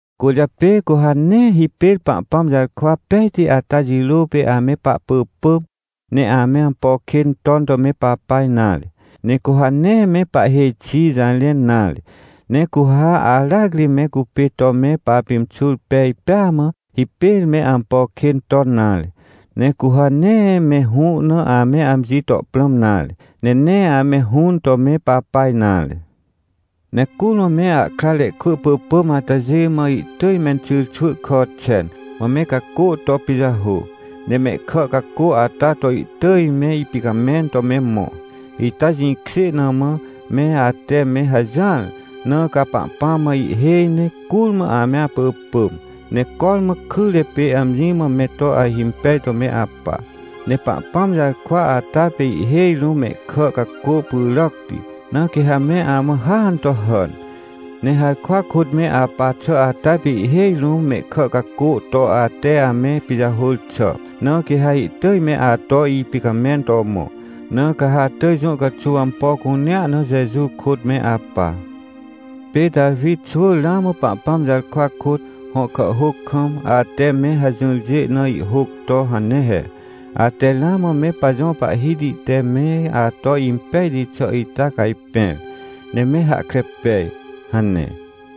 Cwỳrjapê, cu ha nee hipêr Pahpãm jarkwa pejti ata jirô pê ame pahpỳpỳm, ne ame ampo kên ton to me papa nare. Ne cu ha nee me pahhêj xi jarẽn nare. Ne cu ha aracri me cupê to me papimxur pej pêa mã, hipêr me ampo kên ton nare. Ne cu ha nee me hũ na ame amji to prãm nare, ne nee ame hũn to me papa nare. Ne curmã me ahkrare kwỳ pỳpỳm atajê mã ihtỳj menxyrxwỳ kà xen, mã me cacô to pijahô, ne mehkà cacô ata to ihtỳj me ipicamẽn to me mõ. Ita jĩkjê na mã, me ate me hajỹar. Na ca Pahpãm mã ihhêj ne curmã ame apỳpỳm, ne cormã kyre pê amji mã me to ahimpej to me apa. Ne Pahpãm jarkwa ata pê ihhêj rũm mehkà cacô pyràcti, na quê ha me amã hàan to hàn. Ne harkwa kôt me apa xà ata pê ihhêj rũm mehkà cacô to ate ame pijahôr xà, na quê ha ihtỳj me ato ipicamẽn to mõ. Na ca ha atỳj jũ caxuw ampo cunea na Jeju kôt me apa. Pê Tawi xwỳ ramã Pahpãm jarkwa kôt, hõ kàhhôc kam, ate me hajỹrjê na ihhôc to hane he: “Ate ramã me pajõ Pahhiti te me ato impejti xà ita cajpẽr, ne me hahkre pej” hane.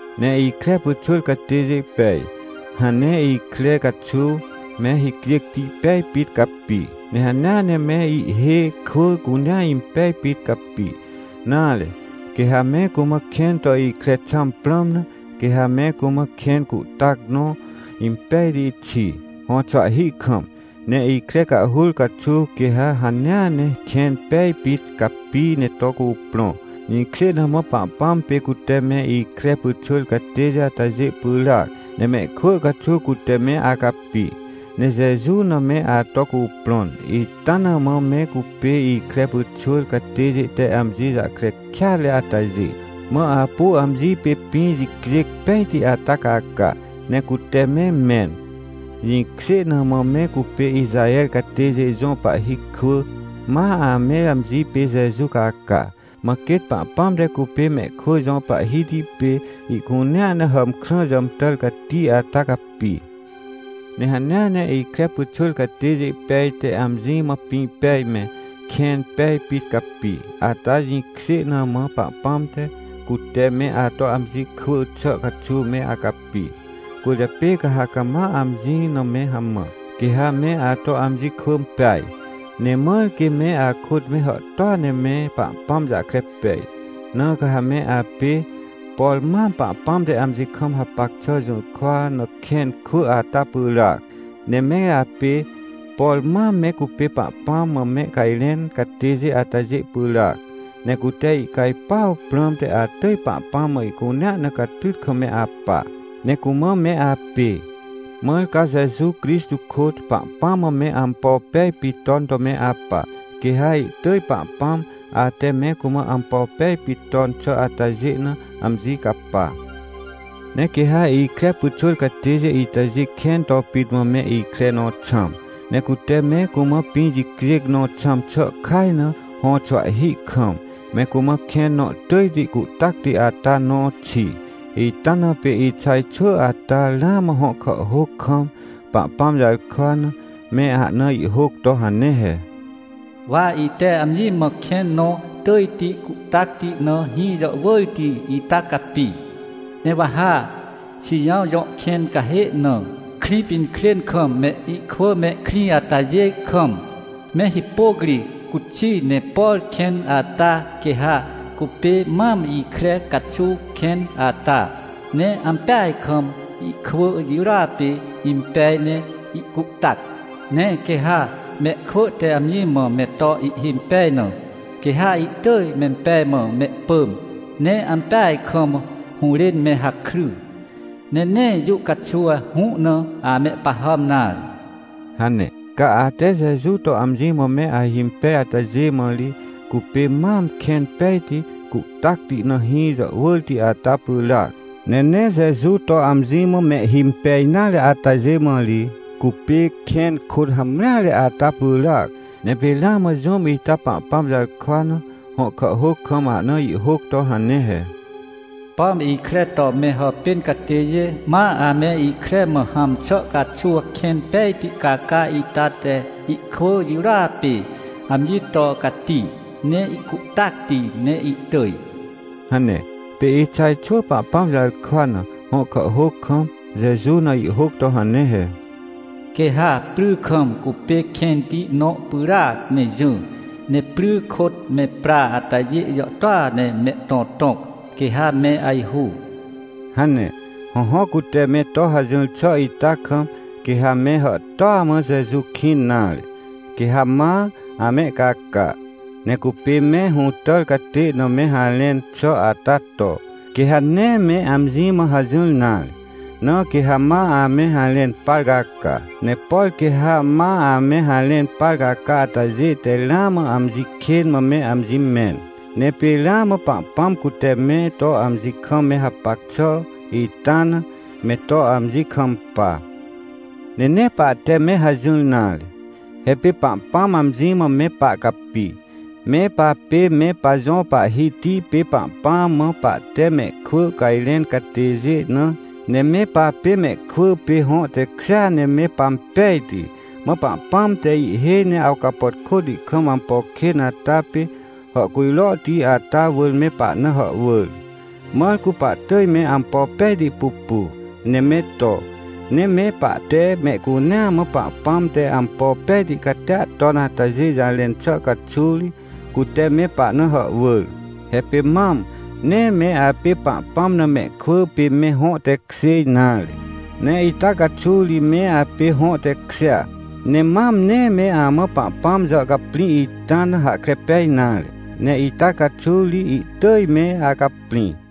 Ne ikre pyxwỳr catêjê pej, hãn ne ikre caxuw, me hicjêcti pej pit capi, ne hanea ne me ihhê kwỳ cunea impej pit capi. Nare, quê ha me cumã kẽn to ikre xãm prãm na, quê ha me cumã kẽn cuhtac nõ impejti xi, hõxwahhi kam, ne ikre cahhur caxuw quê ha hanea ne kẽn pej pit capi ne to cuprõ. Jĩkjê na mã Pahpãm pê cute me ikre pyxwỳr catêjê atajê pyràac, ne mehkwỳ caxuw cute me acapi, ne Jeju na me ato cuprõn. Ita na mã me cupê ikre pyxwỳr catêjê te amji jahkre kêatre atajê, ma apu amji pê pĩ jicjêc pejti ata caca, ne cute me mẽn. Jĩkjê na mã me cupê Ixaher catêjê jõ pahhi kwỳ, ma ame amji pê Jeju caca. Mã quêt Pahpãm te cupê mehkwỳ jõ Pahhiti pê ihcunea na hàmkrã jàmtàr cati ata capi. Ne hanea ne ikre pyxwỳr catêjê pej te amji mã pĩ pej me, kẽn pej pit capi, ata jĩkjê na mã Pahpãm te, cute me ato amji kwỳ xà caxuw me acapi. Cwỳrjapê ca ha cama amji na me hamã, quê ha me ato amji kwỳ peaj, ne mãr quê me akôt me hàhtôa ne me Pahpãm jahkre pej. Na ca ha me apê, por mam Pahpãm te amji kam hapac xà jũrkwa na kẽn kwỳ ata pyràac. Ne me apê, por mam me cupê Pahpãm mã mehcajrẽn catêjê atajê pyràac, ne cute ihcajpuaw prãmte atỳj Pahpãm mã ihcunea na catyt kam me apa, ne cumã me apê. Mãr ca Jeju Crixtô kôt, Pahpãm mã me ampo pej pit ton to me apa, quê ha ihtỳj Pahpãm, ate me cumã ampo pej pit ton xà atajê na, amji capa. Ne quê ha ikre pyxwỳr catêjê itajê kẽn to pit mã me ikre nõ xãm, ne cute me cumã pĩ jicjêc nõ xãm xà kaj na, hõxwahhi kam, me cumã kẽn nõ tỳjti cuhtacti ata nõ xi. Ita na pê Ixaj xwỳ ata, ramã hõ kàhhôc kam, Pahpãm jarkwa na, me ahna ihhôc to hane he: “Wa ite amji mã kẽn nõ tỳjti cuhtacti na hĩ jàhwỳrti ita capi, ne wa ha Xijãw jõ kẽncahê na, Krĩpinkrên kam me ikwỳ mehkrĩ atajê kam, me hipôc ri cuxi. Ne por kẽn ata quê ha cupê mam ikre caxuw kẽn ata, ne ampeaj kam ihkwỳ jirôa pê impej ne ihcuhtac. Ne quê ha mehkwỳ te amji mã me to ihhimpej na, quê ha ihtỳj mempej mã mehpỳm, ne ampeaj kam hũrên me hakry, ne nee jũ caxuw hũ na amehpahàm nare” hane. Ca ate Jeju to amji mã me ahimpej atajê mã ri, cupê mam kẽn pejti, cuhtacti na hĩ jàhwỳrti ata pyràac. Ne nee Jeju to amji mã mehhimpej nare atajê mã ri, cupê kẽn kôt hamreare ata pyràac. Ne pê ramã jũm ita Pahpãm jarkwa na, hõ kàhhôc kam ahna ihhôc to hane he: “Pom ikre to me hàpên catêjê, ma ame ikre mã hãm xà caxuw kẽn pejti caca ita te ihkwỳ jirôa pê amji to cati, ne ihcuhtacti ne ihtỳj” hane. Pê Ixaj xwỳ Pahpãm jarkwa na, hõ kàhhôc kam, Jeju na ihhôc to hane he: “Quê ha pry kam cupê kẽnti nõ pyràac ne jỹ, ne pry kôt me pra atajê jàhtôa ne mehtõtõc, quê ha me ajhu” hane. Hõhõ, cute me to hajỹr xà ita kam, quê ha me hàhtôa mã Jeju kĩn nare, quê ha ma amehcaca. Ne cupê me hũtàr catê na me harẽn xà ata to, quê ha nee me amji mã hajỹr nare, na quê ha ma ame harẽn par caca. Ne por quê ha ma ame harẽn par caca atajê te ramã amji kên mã me amji mẽn. Ne pê ramã Pahpãm cute me to amji kam me hapac xà ita na, me to amji kampa. Ne nee pahte me hajỹr nare. He pê Pahpãm amji mã me pahcapi, me papê me pajõ Pahhiti pê Pahpãm mã pahte mehkwỳ cajrẽn catêjê na. Ne me papê mehkwỳ pê hõ tekjêa ne me pampejti. Mã Pahpãm te ihhêj ne awcapàtkôti kam ampo kên ata pê, hàhcujrohti ata wỳr me pahna hàhwỳr, mãr cu pahtỳj me ampo pejti pupu, ne me to. Ne me pahte mehcunea mã Pahpãm te ampo pejti catia ton atajê jarẽn xà caxuw ri, cute me pahna hàhwỳr. He pê mam, nee me apê Pahpãm na mehkwỳ pê me hõ tekjê nare, ne ita caxuw ri me apê hõ tekjêa. Ne mam nee me amã Pahpãm jàhcaprĩ ita na hahkre pej nare, ne ita caxuw ri ihtỳj me acaprĩ.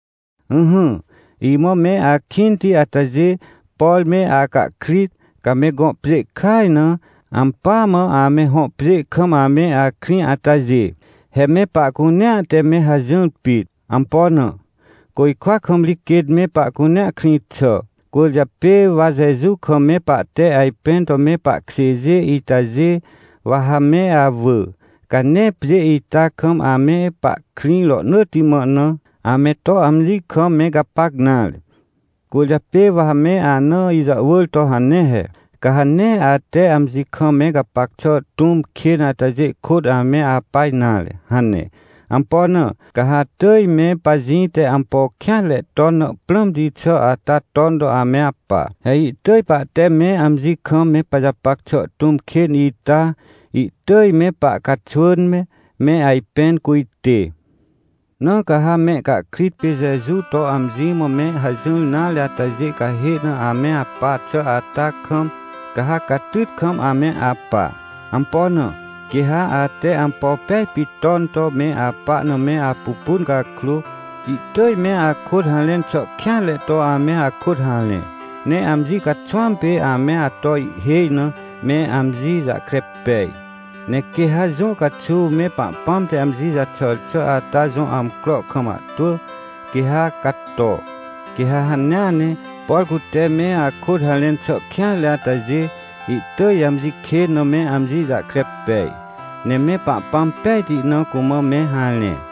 Ỹhỹ, imã me akĩnti atajê, por me acahkrit, ca me gõ pjê kaj na, ampỳa mã ame hõ pjê kam ame akrĩ atajê. He me pahcunea te me hajỹr pit. Ampo na? Côjkwa kam ri quêt me pahcunea krĩ xà. Cwỳrjapê wa Jeju kam me pahte ajpẽn to me pahkjêjê itajê, wa ha me awỳ, ca nee pjê ita kam ame pahkrĩ rohnỳtti mã na, ame to amji kam me gapac nare. Cwỳrjapê wa ha me ana ijàhwỳr to hane he: — Ca ha nee ate amji kam me gapac xà tũm kên atajê kôt ame apa nare — hane. Ampo na? Ca ha atỳj me pajĩ te ampo kêanre ton na prãmti xà ata ton to ame apa. He ihtỳj pahte me amji kam me pajapac xà tũm kên ita, ihtỳj me pahcaxwỳn me, me ajpẽn cujtê. Na ca ha mehcahkrit pê Jeju to amji mã me hajỹr nare atajê cahê na ame apa xà ata kam, ca ha catyt kam ame apa. Ampo na? Quê ha ate ampo pej pit ton to me apa na me apupun cakrô, ihtỳj me akôt harẽn xà kêanre to ame akôt harẽ, ne amji caxwãm pê ame ato ihhêj na, me amji jahkre pej. Ne quê ha jũ caxuw me Pahpãm te amji jaxàr xà ata jõ amcro kam ahtwỳ, quê ha cato, quê ha hanea ne, por cute me akôt harẽn xà kêanre atajê, ihtỳj amji kên na me amji jahkre pej, ne me Pahpãm pejti na cumã me harẽ.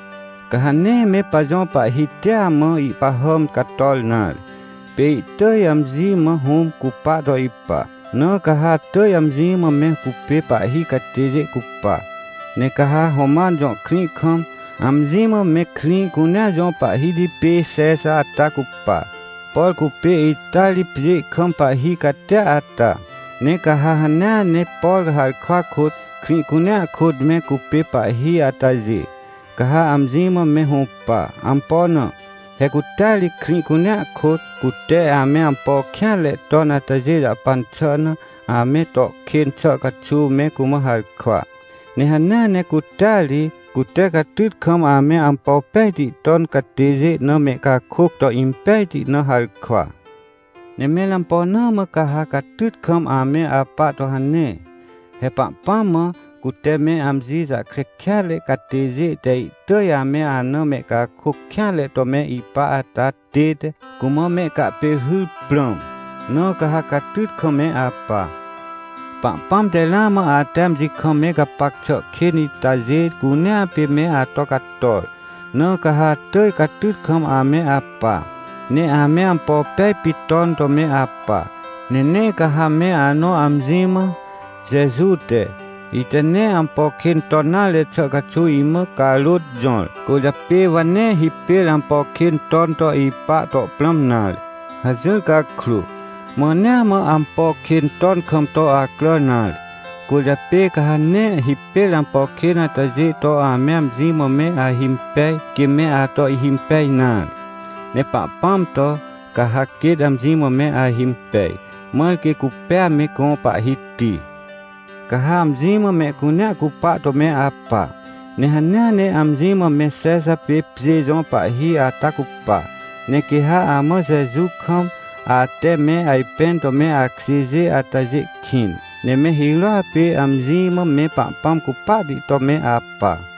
Ca ha nee me pajõ Pahhitia mã ihpahàm cator nare. Pê ihtỳj amji mã Hũm cupa to ipa, na ca ha atỳj amji mã me cupê pahhi catêjê cupa. Ne ca ha Roman jõ krĩ kam, amji mã me krĩ cunea jõ pahhiti pê Xexa ata cupa, por cupê ita ri pjê kam pahhi catia ata. Ne ca ha hanea ne por harkwa kôt, krĩ cunea kôt me cupê pahhi atajê, ca ha amji mã me hũpa. Ampo na? He cutea ri krĩ cunea kôt, cute ame ampo kêanre ton atajê jahpan xà na, ame to kên xà caxuw me cumã harkwa. Ne hanea ne cutea ri, cute catyt kam ame ampo pejti ton catêjê na mehcakôc to impejti na harkwa. Ne mẽr ampo na mã ca ha catyt kam ame apa to hane? He Pahpãm mã, cute me amji jahkre kêatre catêjê te ihtỳj ame ana mehcakôc kêanre to me ipa ata tête, cumã mehcahpêrhyr prãm. Na ca ha catyt kam me apa. Pahpãm te ramã ate amji kam me gapac xà kên itajê cunea pê me ato cator, na ca ha atỳj catyt kam ame apa, ne ame ampo pej pit ton to me apa. Ne nee ca ha me anõ amji mã: — Jeju te, ite nee ampo kên ton nare xà caxuw imã carôt jõr. Cwỳrjapê wa nee hipêr ampo kên ton to ipa to prãm nare — hajỹr cakrô, mãnea mã ampo kên ton kam to acrà nare. Cwỳrjapê ca ha nee hipêr ampo kên atajê to ame amji mã me ahimpej, quê me ato ihhimpej nare, ne Pahpãm to, ca ha quêt amji mã me ahimpej. Mãr quê cupêa me gõ Pahhiti. Ca ha amji mã mehcunea cupa to me apa, ne hanea ne amji mã me Xexa pê pjê jõ pahhi ata cupa. Ne quê ha amã Jeju kam, ate me ajpẽn to me akjêjê atajê kĩn. Ne me hirôa pê amji mã me Pahpãm cupahti to me apa.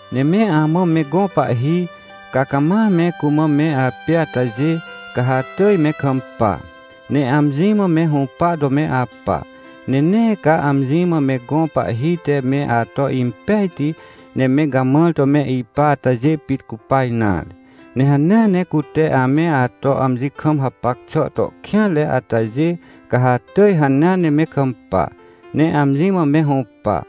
Ne me amã me gõ pahhi, ca cama me cumã me apê atajê, ca ha atỳj me kampa, ne amji mã me hũpa to me apa. Ne nee ca amji mã me gõ pahhi te me ato impejti, ne me gamãr to me ipa atajê pit cupa nare, ne hanea ne cute ame ato amji kam hapac xà to kêanre atajê, ca ha atỳj hanea ne me kampa, ne amji mã me hũpa.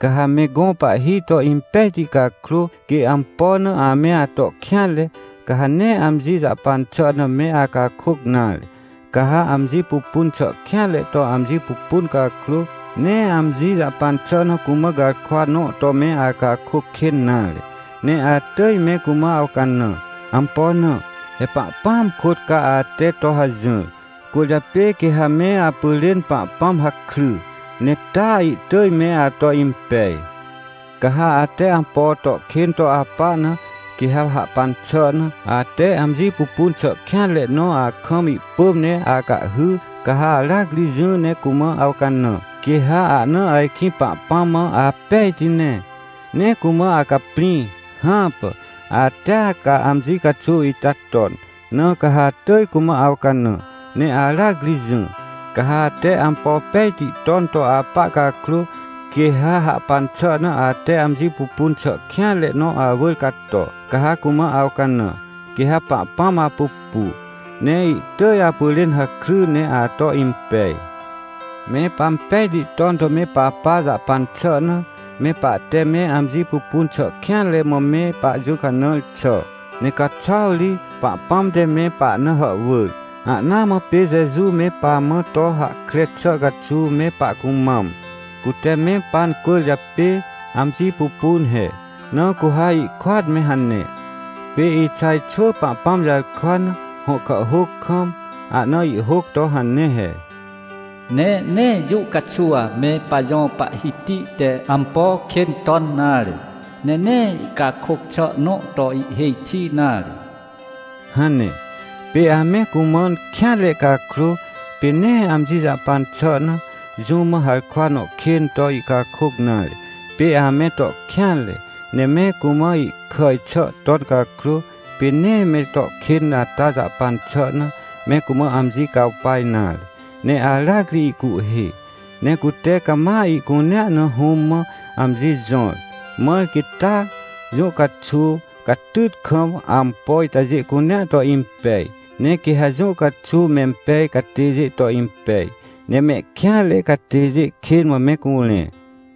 Ca ha me gõ pahhi to impejti cakrô, quê ampo na ame ato kêanre, ca ha nee amji jahpan xà na me acakôc nare. Ca ha amji pupun xà kêanre to amji pupun cakrô, nee amji jahpan xà na cumã garkwa nõ to me acakôc kên nare, ne atỳj me cumã awcanã. Ampo na? He Pahpãam kôt ca ate to hajỹr, cwỳrjapê quê ha me apyrên Pahpãm hakry, ne taa ihtỳj me ato impej. Ca ha ate ampo to kên to apa na, quê ha hahpan xà na, ate amji pupun xà kêanre nõ akam ihpỳm ne acahhy, ca ha aracri jỹ ne cumã awcanã, quê ha ahna ajkĩ Pahpãm mã apejti ne, ne cumã acaprĩ? Hãpà, atea ca amji caxuw ita ton, na ca ha atỳj cumã awcanã, ne aracri jỹ. Ca ha ate ampo pejti ton to apa cakrô, quê ha hahpan xà na ate amji pupun xà kêanre nõ awỳr cato, ca ha cumã awcanã, quê ha Pahpãm apupu, ne ihtỳj apyrên hakry ne ato impej. Me pampejti ton to me papa jahpan xà na, me pahte me amji pupun xà kêanre mã me pajũcanãr xà. Ne caxuaw ri, Pahpãm te me pahna hàhwỳr. Ahnaa mã pê Jeju me pamã to hahkre xà caxuw me pahcumam, cute me pancwỳrjapê amji pupun he. Na cu ha ihkôat me hane. Pê Ixaj xwỳ Pahpãm jarkwa na, hõ kàhhôc kam, ahna ihhôc to hane he: “Ne nee jũ caxuw me pajõ Pahhiti te ampo kên ton nare, ne nee ihcakôc xà nõ to ihhêj xi nare” hane. Pê ame cumãn kêanre cakrô, pê nee amji jahpan xà na, jũm mã harkwa nõ kên to ihcakôc nare. Pê ame to kêanre, ne me cumã ihkàj xà ton cakrô, pê nee me to kên ata jahpan xà na, me cumã amji cawpa nare, ne aracri ihcuhhê. Ne cute cama ihcunea na Hũm mã amji jõr, mãr quê taa, jũ caxuw, catyt kam, ampo itajê cunea to impej. Ne quê ha jũ caxuw mempej catêjê to impej, ne mehkêanre catêjê kên mã me curẽ.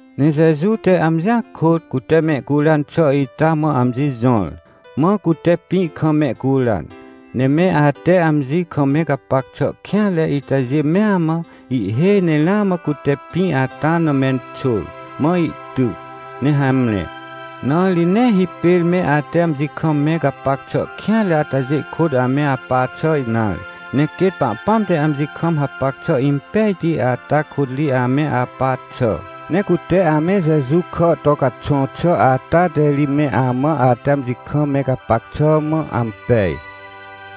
Ne Jeju te amjia kôt, cute mehcuran xà ita mã amji jõr, mã cute pĩ kam mehcuran. Ne me ate amji kam me gapac xà kêanre itajê mea mã, ihhêj ne ramã cute pĩ ata na menxôr, mã ihtyc, ne hamre. Na ri nee hipêr me ate amji kam me gapac xà kêanre atajê kôt ame apa xà nare. Ne quêt Pahpãm te amji kam hapac xà impejti ata kôt ri ame apa xà. Ne cute ame Jeju kà to caxõ xà ata te ri me amã ate amji kam me gapac xà mã ampej.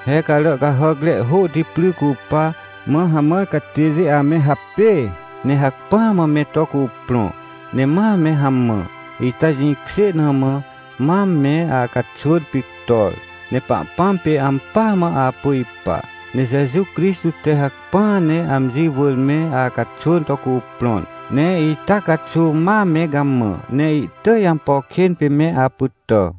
He carà cahàcre hôhti pry cupa, mã hamãr catêjê ame hapêê, ne hacpỹa mã me to cuprõ, ne ma me hamã, ita jĩkjê na mã, mam me acaxwỳn pictor, ne Pahpãm pê ampỳa mã apu ipa. Ne Jeju Crixtô te hacpỹa ne amji wỳr me acaxwỳn to cuprõn, ne ita caxuw ma me gamã, ne ihtỳj ampo kên pê me apytà.